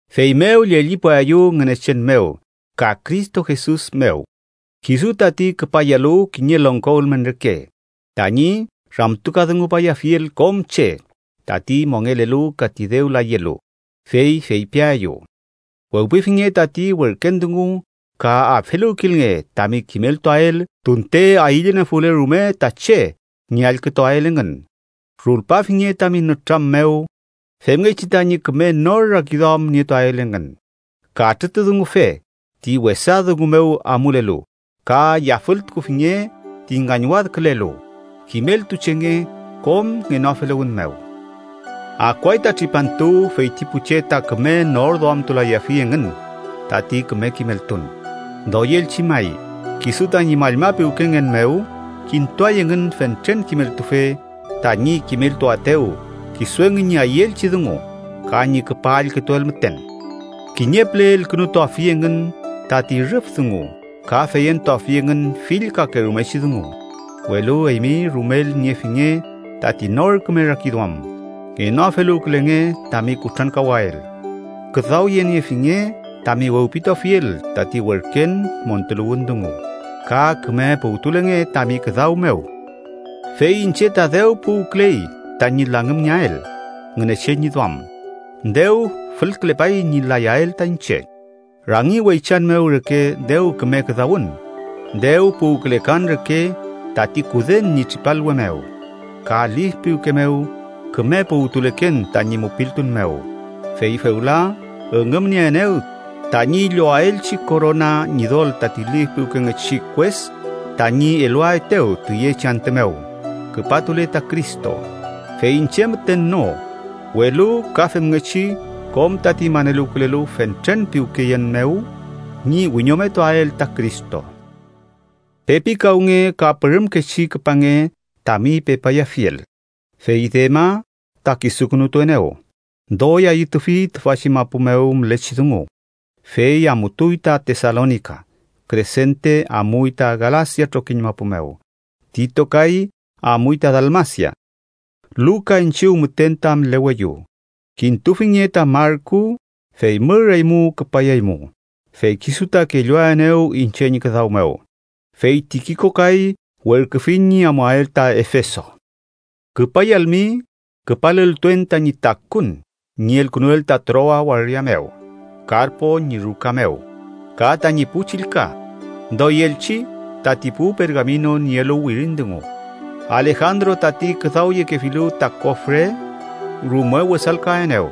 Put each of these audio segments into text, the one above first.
Feymew llellipuaeyu Ngünechen mew ka Cristo Jesus mew kisu tati küpayalu kiñe longko ülmen reke tañi ramtukadungupayafiel kom che tati mongelelu ka ti dew layelu, fey feypiaeyu: wewpifinge tati werken dungu, ka afeluwkilnge tami kimeltuael tunte ayüllenofule rume ta che ñi allkütuael engün. Rulpafinge tami nütram mew femngechi tañi küme nor rakiduam nietuael engün, katrütudungufe ti wesa dungu mew amulelu, ka yafültukufinge ti ngañwadkülelu, kimeltuchenge kom ngenoafeluwün mew. Akuay ta tripantu feyti pu che ta küme norduamtulayafi engün tati küme kimeltun. Doyelchi may, kisu tañi mallma piwkengen mew kintuay engün fentren kimeltufe tañi kimeltuaetew kisu engün ñi ayüelchi dungu ka ñi küpa allkütuael müten. Kiñe püle elkünutuafi engün tati rüf dungu ka feyentuafi engün fill kakerumechi dungu. Welu eymi rumel niefinge tati nor küme rakiduam, ngenoafeluwkülenge tami kutrankawael, küdawyeniefinge tami wewpituafiel tati werken montuluwün dungu, ka küme puwtulenge tami küdaw mew. Fey iñche ta dew puwküley tañi langümngeael Ngünechen ñi duam. Dew fülkülepay ñi layael ta iñche. Rangi weychan mew reke dew küme küdawün, dew puwkülekan reke tati kuden ñi tripalwe mew, ka lif piwke mew küme puwtuleken tañi mupiltun mew. Fey fewla üngümnieenew tañi llowaelchi korona Ñidol tati lif piwkengechi kues tañi eluaetew tüyechi antü mew küpatule ta Cristo. Fey iñche müten no, welu ka femngechi kom tati maneluwkülelu fentren piwkeyen mew ñi wiñometuael ta Cristo. Pepikawnge ka pürümkechi küpange tami pepayafiel. Fey Dema ta kisukünutuenew. Doy ayütufi tüfachi mapu mew mülechi dungu, fey amutuy ta Tesalonika. Kresente amuy ta Galasia trokiñ mapu mew, Tito kay amuy ta Dalmasia. Luka iñchiw müten ta müleweyu. Kintufinge ta Marku, fey mür eymu küpayaymu, fey kisu ta kelluaenew iñche ñi küdaw mew. Fey Tikiko kay werküfiñ ñi amuael ta Efeso. Küpayalmi, küpaleltuen tañi takun ñi elkünuel ta Troa waria mew, Karpo ñi ruka mew, ka tañi pu chillka, doyelchi tati pu pergamino nielu wirin dungu. Alejandro tati küdawyekefilu ta kofre, rume wesalkaenew.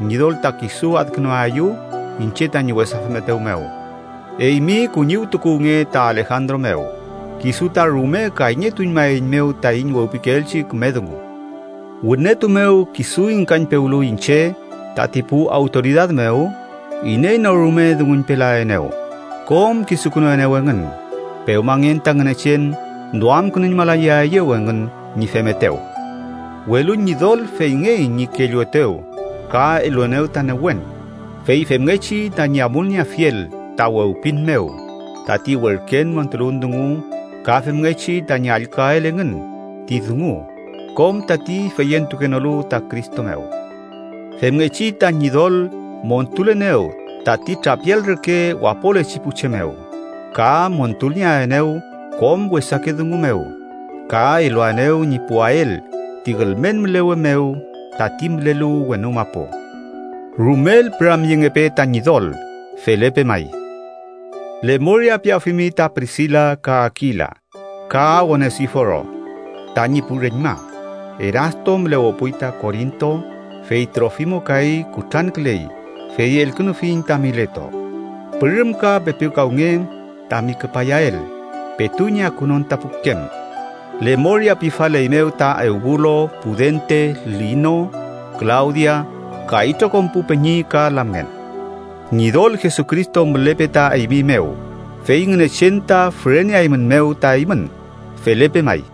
Ñidol ta kisu adkünuaeyew iñche tañi wesa femetew mew. Eymi kuñiwtukuwnge ta Alejandro mew, kisu ta rume kayñetuñmaeiñmew taiñ wewpikeelchi küme dungu. Wünetu mew kisu ingkañpewlu iñche tati pu awtoridad mew, iney no rume dunguñpelaenew; kom kisukünuenew engün. Pewmangen ta Ngünechen duamkünuñmalayaeyew engün ñi femetew. Welu Ñidol feyngey ñi kelluetew ka eluenew ta newen. Fey femngechi tañi amulnieafiel ta wewpin mew tati werken montuluwün dungu ka femngechi tañi allküael engün ti dungu kom tati feyentukenolu ta Cristo mew. Femngechi ta Ñidol montulenew tati trapial reke wapolechi pu che mew ka montulnieaenew kom wesake dungu mew, ka eluaenew ñi puwael ti ülmen mülewe mew tati mülelu wenu mapu. ¡Rumel püramyengepe ta Ñidol! Felepe may. Lemoria piafimi ta Prisila ka Akila ka Onesiforo tañi pu reñma. Erasto mülewepuy ta Korinto, fey Trofimo kay kutranküley fey elkünufiñ ta Mileto. Pürümka pepikawnge tami küpayael petu ñi akunon ta pukem. Lemoria pifaleymew ta Eubulo, Pudente, Lino, Klawdia ka itrokom pu peñi ka lamngen. Ñidol Jesucristo mülepe ta eymi mew, fey Ngünechen ta füreneaeymünmew ta eymün. Felepe may.